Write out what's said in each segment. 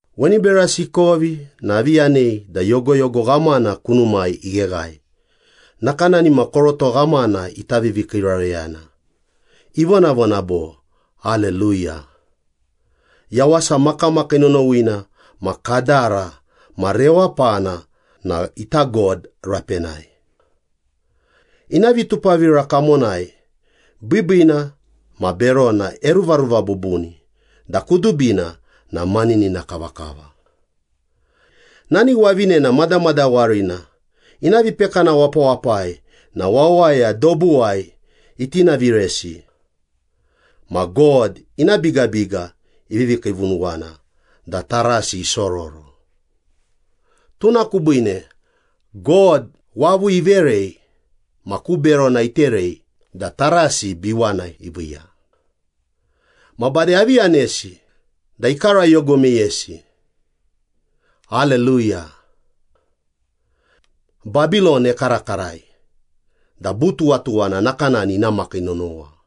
Weni berasi ikovi na avi yanei da yogoyogo ghamana kunumai igheghae nakanani ma koroto ghamana ita vivikiirareyana, ivonavona bo, “Aleluya. Yawasa makamakii nonowina ma kadara ma rewapana na ita God rapenai. Ina vitupavira kamonai biibiina ma berona eruvaruva bubuni da kudubina na maninina kavakava. Nani wavinena madamadawarina ina vipekana wapawapai na wawaya dobuwai itinaviresi. Ma God ina bigabiga ivivi kiivunuwana da tarasi isororo. Tuna kubiine God wavu iverei ma ku berona iterei da tarasi biwana iviiya.” Ma bade avi yanesi da ikarayogo meyesi, “Aleluya. Babilon ekarakarai da butuwatuwana nakanani ina makii nonowa.”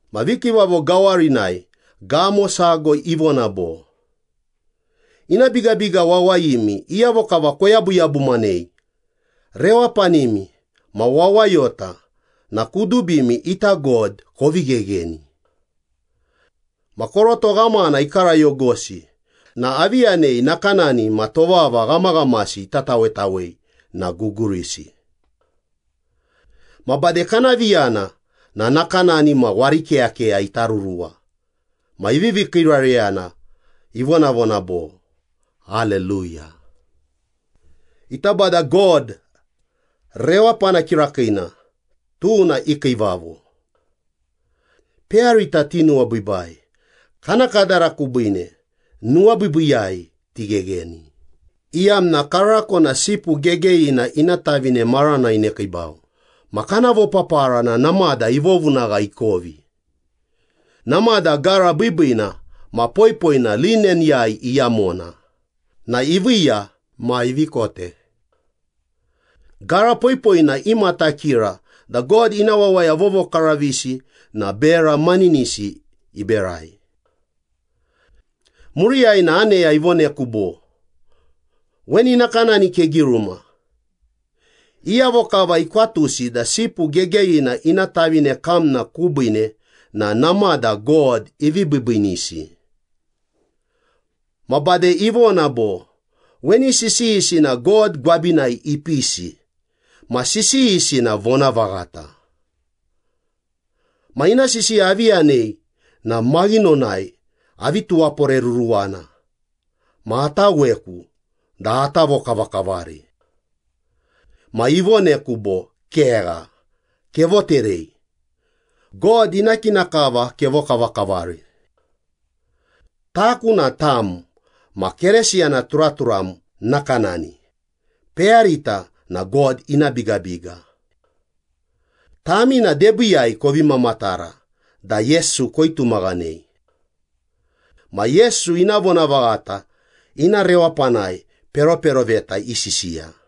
Ma vikiivavo gawarinai gamo sago ivona bo, “Ina bigabiga wawayimi iyavo kava koyabuyabumanei, rewapanimi ma wawayota na kudubimi ita God kovi ghegheni!” Ma koroto ghamana ikarayogosi na avi yanei nakanani ma tovava ghamaghamasi ita tawetawei na gugurisi. Ma bade kana viyana na nakanani ma warikeyakeya ita ruruwa ma ivivi kiirareyana ivonavona bo, “Aleluya. Ita Bada God rewapana kirakiina tuna ikiivavo. Peyarita tinuwabiibai. Kana kadara kubiine nuwabiibiiyai tighegheni, iyamna karako na Sipu Gegeyina ina tavine marana inekiibau ma kana vopapara na namada ivovunagha ikovi. Namada gara biibiina ma poipoina lineniyai iyamona na iviiya ma ivi kote.” Gara poipoina imatakira da God ina wawaya vovokaravisi na bera maninisi iberai. Muriyai na aneya ivoneku bo, “Weni nakanani kegiruma, ‘Iyavo kava ikwatusi da Sipu Gegeyina ina tavine kamna kubiine na namada God ivi biibiinisi.’” Ma bade ivona bo, “Weni sisiyisi na God gwabinai ipisi ma sisiyisi na vonavaghata.” Ma ina sisiya avi yanei na maghinonai avi tuwaporeruruwana ma ataweku da ata vokavakavari. Ma ivoneku bo, “Kegha. Kevoterei. God ina kina kava kevokavakavari. Taku na tam ma Keresiyana turaturam nakanani, peyarita na God ina bigabiga. Tami na debiiyai kovi mamatara da Yesu koitumaghanei. Ma Yesu ina vonavaghata ina rewapanai peroperoveta isisiya.”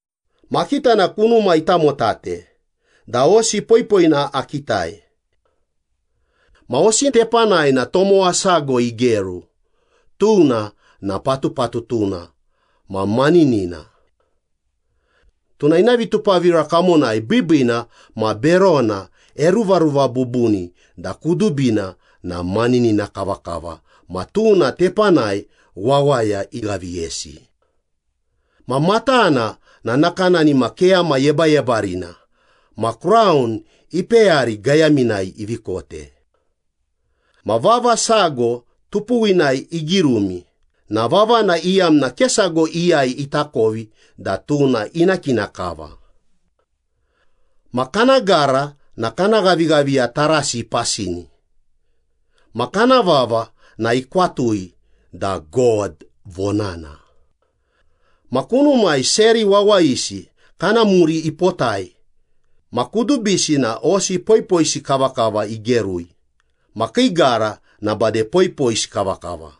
Ma akita na kunuma itamotate da hosi poipoina akitai. Ma hosi tepanai na tomowa sago igeru, tuna na Patupatutuna ma Maninina. Tuna ina vitupavira kamonai biibiina ma berona eruvaruva bubuni da kudubina na maninina kavakava ma tuna tepanai wawaya ighaviyesi. Ma matana na nakanani ma keyama yebayebarina ma kraun ipeyari gayaminai ivi kote. Ma vava sago tupuwinai igirumi na vavana iyamna ke sago iyai itakovi da tuna ina kina kava. Ma kana gara na kana ghavighaviya tarasi ipasini, ma kana vava na ikwatui da God Vonana. Ma kunumai seri wawayisi kana muri ipotai ma kudubisi na hosi poipoisi kavakava igerui ma kii gara na bade poipoisi kavakava.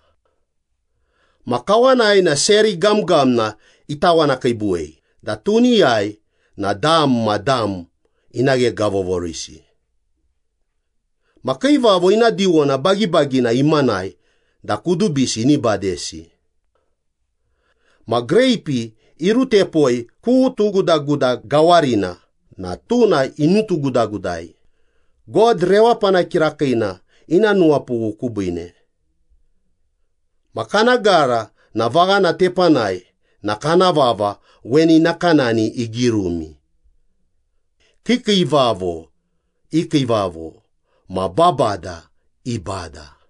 Ma kawanai na seri gamgamna itawanakiibuwei da tuniyai na dam ma dam ina ghegavovorisi. Ma kiivavo ina diwona bagibagina imanai da kudubisi ini badesi. Ma greipi irutepoi ku tugudaguda gawarina na tuna inutugudagudai, God rewapana kirakiina ina nuwapughu kubiine. Ma kana gara ma vaghana tepanai na kana vava weni nakanani igirumi, “Kiikiivavo i Kiivavo ma babada i Bada.”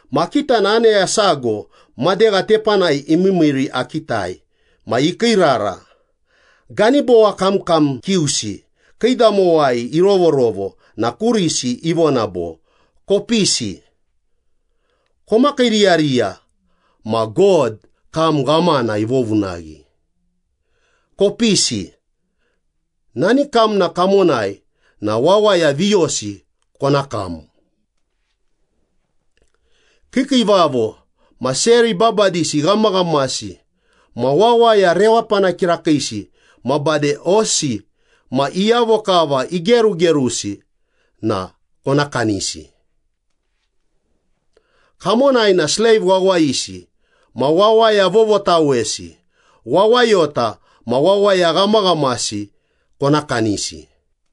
Ma akita na aneya sago madegha tepanai imiimiiri akitai ma ikiirara, ganibowa kamkam kiusi kiidamowai irovorovo na kurisi ivona bo, “Kopisi, komakiiriyariya ma God kam ghamana ivovunaghi. Kopisi, nani kamna kamonai na wawaya viyosi kona kam. Kiikiivavo ma seri babadisi ghamaghamasi ma wawaya rewapana kirakiisi ma bade hosi ma iyavo kava igerugerusi na kona kanisi. Kamonai na sleiv wawayisi ma wawaya vovotawesi, wawayota ma wawaya ghamaghamasi kona kanisi.”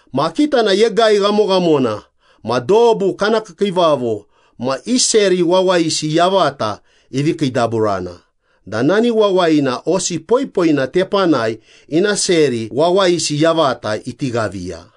Ma akita na yegai ghamoghamona ma dobu kana kiikiivavo ma i seri wawayisi yavata ivi kiidaburana da nani wawayina hosi poipoina tepanai ina seri wawayisi yavata iti ghaviya.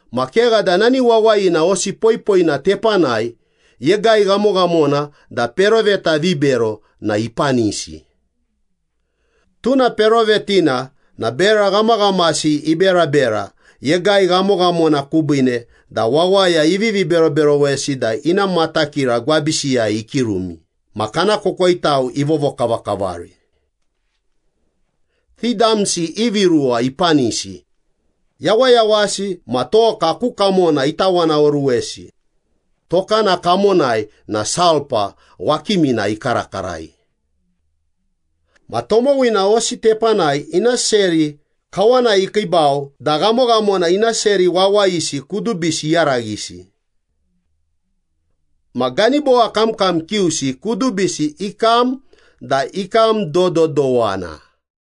Ma kegha da nani wawayina hosi poipoina tepanai yegai ghamoghamona da peroveta vibero na ipanisi. Tuna perovetina na bera ghamaghamasi iberabera yegai ghamoghamona kubiine da wawaya ivivi beroberowesi da ina matakira gwabisiyai ikirumi ma kana kokoitau ivovokavakavari. Ti damsi ivi ruwa ipanisi, yawayawasi ma toka ku kamona itawanaoruwesi, tokana kamonai na sulpa wakimina ikarakarai. Ma tomowina hosi tepanai ina seri kawanai ikiibau da ghamoghamona ina seri wawayisi kudubisi iyaraghisi. Ma ganibowa kamkam kiusi kudubisi ikam da ikam dododowana.